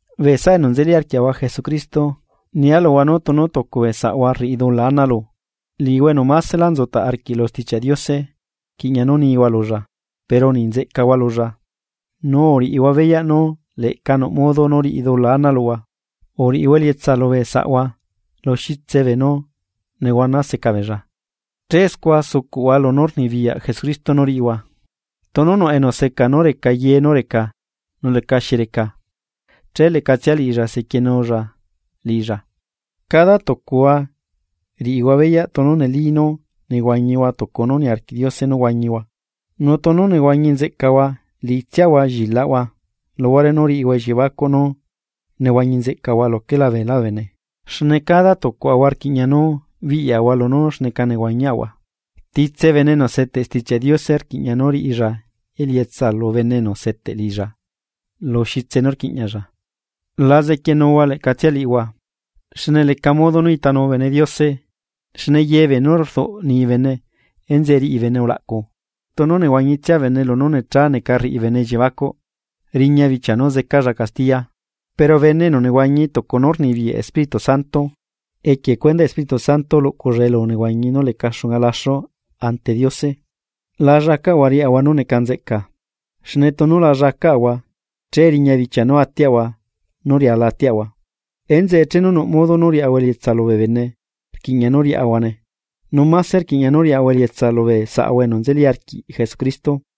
Bee saꞌa enu nzeli arquiaꞌahua Jesucristo, nia luhua nú tunu tucu bee saꞌahua rriꞌi dula ana lu, liꞌihua enu másela nzutaꞌ arquiꞌ lu Stichiaꞌ Diose rquiꞌña nú nihua lulla pero niꞌ nzeꞌcahua lulla. Nu uriꞌihua beyaꞌ nú leꞌca nuꞌ modo nú riꞌi dula ana luhua. Uriꞌihua elietsa lubee saꞌhua lu xitse beenú nehuana seca beella che scua sucuꞌhua lunú rnibiyaꞌ Jesucristo nú riꞌihua. Tunu nuꞌ enu seca nú reca ye nú reca nu lecaxi reca, che leꞌcatsia liꞌilla sequienulla liꞌilla. Cada tucuhua riꞌihua beyaꞌ tunu neli nú nehuañihua tucu nú niarquiꞌ Diose nú huañihua. Nu tunu nehuañi nzeꞌcahua liꞌitsiahua llilaꞌhua luhuare nú riꞌihua elliebacuꞌ nú nehuañi nzeꞌcalahua luquela beelá bee bene. Xne cada tucuaꞌahua rquiꞌña nú biꞌyaꞌahua lunú xneca nehuañiaꞌahua. Titse bene enu seteꞌ Stichiaꞌ Diose rquiꞌña nú riꞌilla elietsa lu bene enu seteꞌ liꞌilla lu xitse nú rquiꞌñalla. La zequienuhua leꞌcatsia liꞌihua, xne leca modo nú itanu bene Diose xne ye beenú rduꞌ ni bene enzeꞌe riꞌi bene ulaꞌcu. Tunu nehuañitsia bene lunú necha neca rriꞌi bene elliebacuꞌ. Riña bichia nú zecalla castiya, pero bene enu nehuañi tucu nú rnibiyaꞌ Espíritu Santo, equie cuendaꞌ Espíritu Santo luꞌculla elu nehuañi nú leca xunga laxu ante Diose. La llacaꞌahua riaꞌahua nú neca nzeꞌca. Xne tunu la llacaꞌahua, che riña bichia nú atiaꞌahua nú riala atiaꞌahua. Enzeꞌe chenu nuꞌ modo nú riaꞌahua elietsa lubee bene rquiꞌña nú riaꞌahuane, nu máse rquiꞌña nú riaꞌahua elietsa lubee saꞌahua enu nzeli arquiꞌ Jesucristo.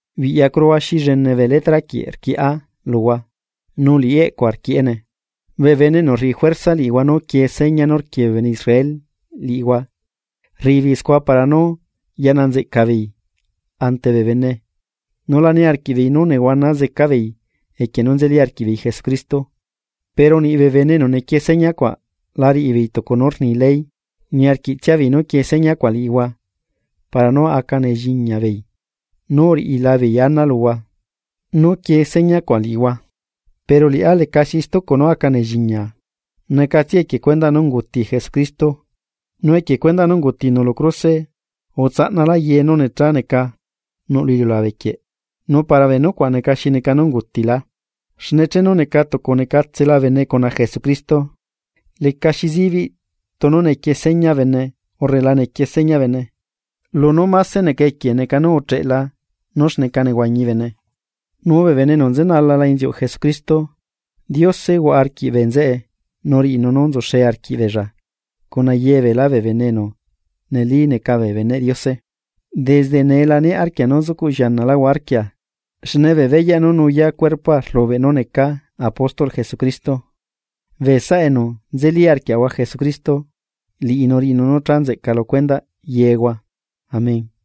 Biꞌyacuruhua xi llene bee letraquieꞌ rquieꞌá luhua nu liꞌi eꞌcua rquieꞌene. Bee bene enu rriꞌi juerza liꞌihua nú quie seña nú rquie bee bene Israel liꞌihua rriꞌi beei scua para nú yaꞌna nzeꞌca beei ante bee bene nu la niarquiꞌbeei nú nehuana zeca beei equie nú nzeli arquiꞌbeei Jesucristo. Pero niꞌ bee bene enu nequie seña cuaꞌ la riꞌibeei tucu nú rni ley. Niarquiꞌtsiabeei nú quie señacuaꞌ liꞌihua para nú aca nelliñabeei nú uriꞌilabeei ana luhua nú quie señacuaꞌ liꞌihua. Pero liꞌá leca xi stucu nú aca nelliñaa, necatsiae equie cuendaꞌ nú unguti Jesucristo. Nu equie cuendaꞌ nú ungutinu lu cruse utsaꞌnalá ye nú nechá neca nuꞌ lu iliulabe quieꞌ, nu para bee nucuaꞌ neca xi neca nú ungutilá. Xne chenu neca tucu necatsela bene cuna Jesucristo lecaxi zibiꞌ tunu nequie seña bene urre la nequie seña bene. Lunú mase neca equie neca nú ucheꞌela nú xneca nehuañi bene. Nu bee bene enu nzenalala inziuꞌ Jesucristo, Diose huaꞌa arquiꞌ bee nzeꞌe nu riꞌinu nú nzuxe arquiꞌ beella cuna yebeelá bee bene enu neli neca bee beneꞌ Diose. Desde nee la niaꞌ arquia nú zucuꞌ llianaláhua arquia. Xne bee beyaꞌ nú nuyaa cuerpoa rlubeꞌ nú necaa apóstolꞌ Jesucristo. Bee saꞌa enu nzeli arquiaꞌahua Jesucristo, liꞌinu riꞌinu nú cha nzeꞌca lu cuendaꞌ yehua. Amén.